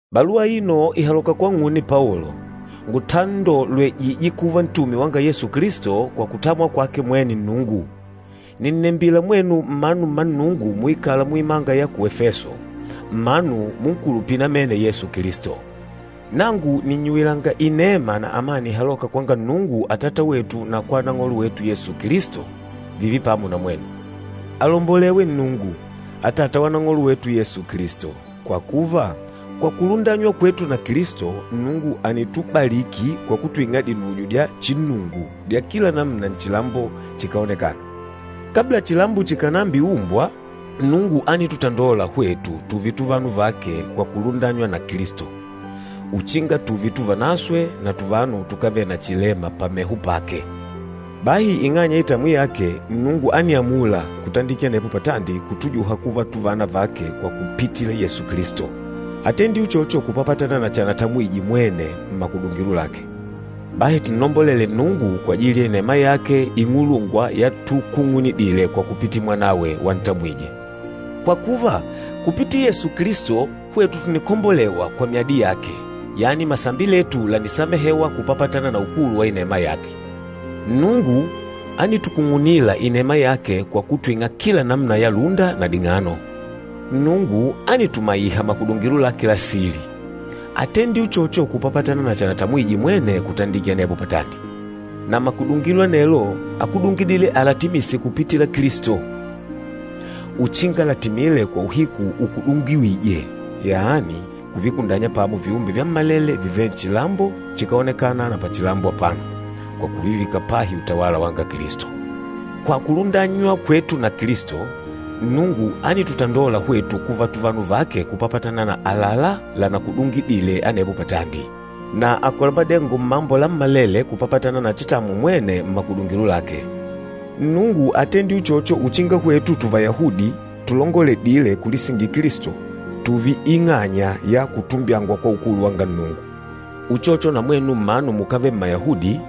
Baluwa aino ìhaloka kwang'une Paolo, ngutandolwejîje kuva ntume wanga Yesu Kilisto kwa kutamwa kwake mwene Nnungu. Nìnnembila mwenu mmanu mma Nnungu muikâla muimanga ya ku Efeso, mmanu munkulupîla namene Yesu Kilisto. Nangu nìnnyuwilanga inema na amani ihalôka kwanga Nnungu Atata wetu na kwa Nang'olo wetu Yesu Kilisto, vììve pamo na mwenu. Alombolewe Nnungu, Atata wa Nang'olo wetu Yesu Kilisto. Kwa kuva, kwa kulundanywa kwetu na Kilisto, Nnungu ànitubaliki kwa kutwing'a dinujo dya chinnungu dya kila namuna nchilambo chikáonekana. Kabla chilambo chikànambiumbwa, Nnungu ánitutandola hwetu tùùve tuvanu vake kwa kulundanywa na Kilisto, uchinga tùùve tuvanaswe na tuvanu tukávele na chilema pameho pake. Bahi ing'anya ya itamwi yake, Nnungu ániamula kutandikila anepo patandi kutujuha kuva tuvana vake kwa kupitila Yesu Kilisto. Átendile uchocho kupapatana na chanatamwije mwene mmakudungilo lake. Bahi tunnombolele Nnungu kwajili ya inema yake ing'ulungwa yatukung'unidile kwa kupitila Mwanawe wantamwije! Kwa kuva, kupitila Yesu Kilisto, hwetu tùnikombolewa kwa myadi yake, yani masambi letu lànisamehewa, kupapatana na ukulu wa inema yake. Nnungu ánitukung'unila inema yake kwa kutwing'a kila namuna ya lúnda na ding'ano. Nnungu ánitumaiha makudungilo lake la sili. Átendile uchocho kupapatana na chanatamwije mwene kutandikila anepo patandi. Na makudungilo anelo ákudungidile alatimise kupitila Kilisto, uchinga latimile kwa uhiku ukudungiwîje, yani kuvikundanya pamo viumbe vyammalele vivêle nchilambo chikáonekana na pachilambo apano, kwa kuvivika pahi utawala wanga Kilisto. Kwa kulundanywa kwetu na Kilisto, Nnungu ánitutandola hwetu kuva tuvanu vake kupapatana na àlalá lanakudungidile anepo patandi, na àkola madengo mmambo lammalele kupapatana na chatamwa mwene mmakudungilo lake. Nnungu átendile uchocho uchinga hwetu Tuvayahudi tulongoledîle kulisingila Kilisto, tùùve ing'anya ya kutumbyangwa kwa ukulu wanga Nnungu. Uchocho na mwenu mmanu mukávele Mmayahudi,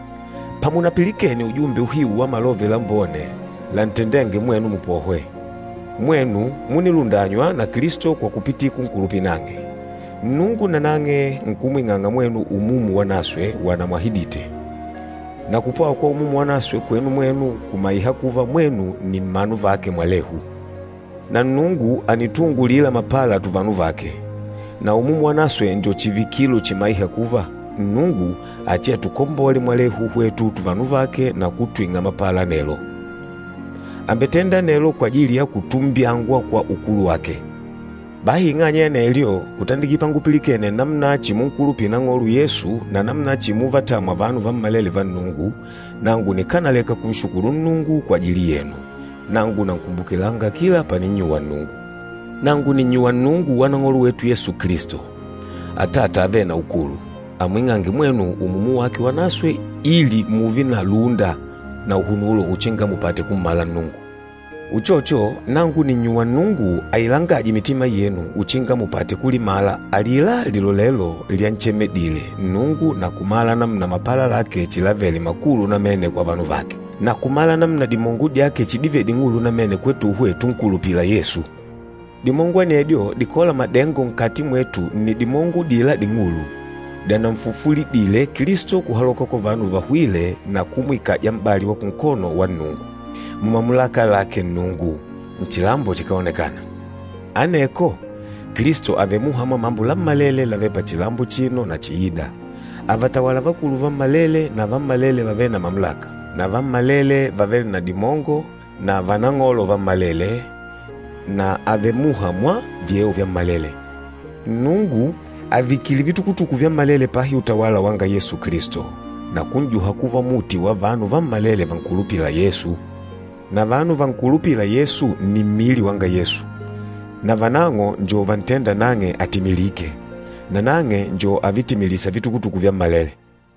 pamunapilikene ujumbe uhiu wa Malove Lambone lantendênge mwenu mupohwe, mwenu múnilundanywa na Kilisto kwa kupitila kunkulupila nang'e. Nnungu nanang'e nkumwing'anga mwenu Umumu Wanaswe wanamwahidite. Na kupwawa kwa Umumu Wanaswe kwenu mwenu kumaiha kuva mwenu nni mmanu vake mwalehu. Na Nnungu ànituungulila mapala tuvanu vake. Na Umumu Wanaswe njo chivikilo chimaîha kuva, Nnungu achiatukombole mwalehu hwetu tuvanu vake na kutwing'a mapala anelo. Àmbetenda anelo kwajili ya kutumbyangwa kwa ukulu wake. Bahi ing'anya ya anelyo, kutandikila pangupilikene namuna chimunkulupila Nang'olo Yesu na namuna chimuvatamwa vanu vammalele va Nnungu, nangu nikánaleka kunshukulu Nnungu kwajili yenu. Nangu nankumbukilanga kila paninnyuwa Nnungu. Nangu nìnnyuwa Nnungu wa Nang'olo wetu Yesu Kilisto, Atata avêle na ukulu, amwing'ange mwenu Umumu wake Wanaswe ili mùùve na lúnda na uhunulo uchinga mupate kummala Nnungu. Uchocho, nangu nìnnyuwa Nnungu ailangaje mitima yenu uchinga mupate kulimala alila lilolelo lyanchemedile Nnungu na kumala namuna mapala lake chilavele makulu namene kwa vanu vake, na kumala namuna dimongo dyake chidivele ding'ulu namene kwetuhwe tunkulupîla Yesu. Dimongo anedyo dikôla madengo nkati mwetu nni dimongo udila ding'ulu, dyananfufulidile Kilisto kuhaloka kwa vanu vahwîle na kumwikaja m'bali wa kunkono wa Nnungu, mumamulaka lake Nnungu, nchilambo chikáonekana. Aneko Kilisto àvele muha mwa mambo lammalele lavêle pachilambo achino na chiîda. Àvatawala vakulu vammalele, na vammalele vavêle na mamulaka, na vammalele vavêle na dimongo, na vanang'olo vammalele, na àvele muha mwa vyeo vyammalele. Nnungu àvikile vitukutuku vyammalele pahi utawala wanga Yesu Kilisto, na kun'juha kuva muti wa vanu vammalele vankulupîla Yesu. Na vanu vankulupîla Yesu nni mmili wanga Yesu, na vanang'o njo vantênda nang'e atimilike, nanang'e njo avitimilîsa vitukutuku vyammalele.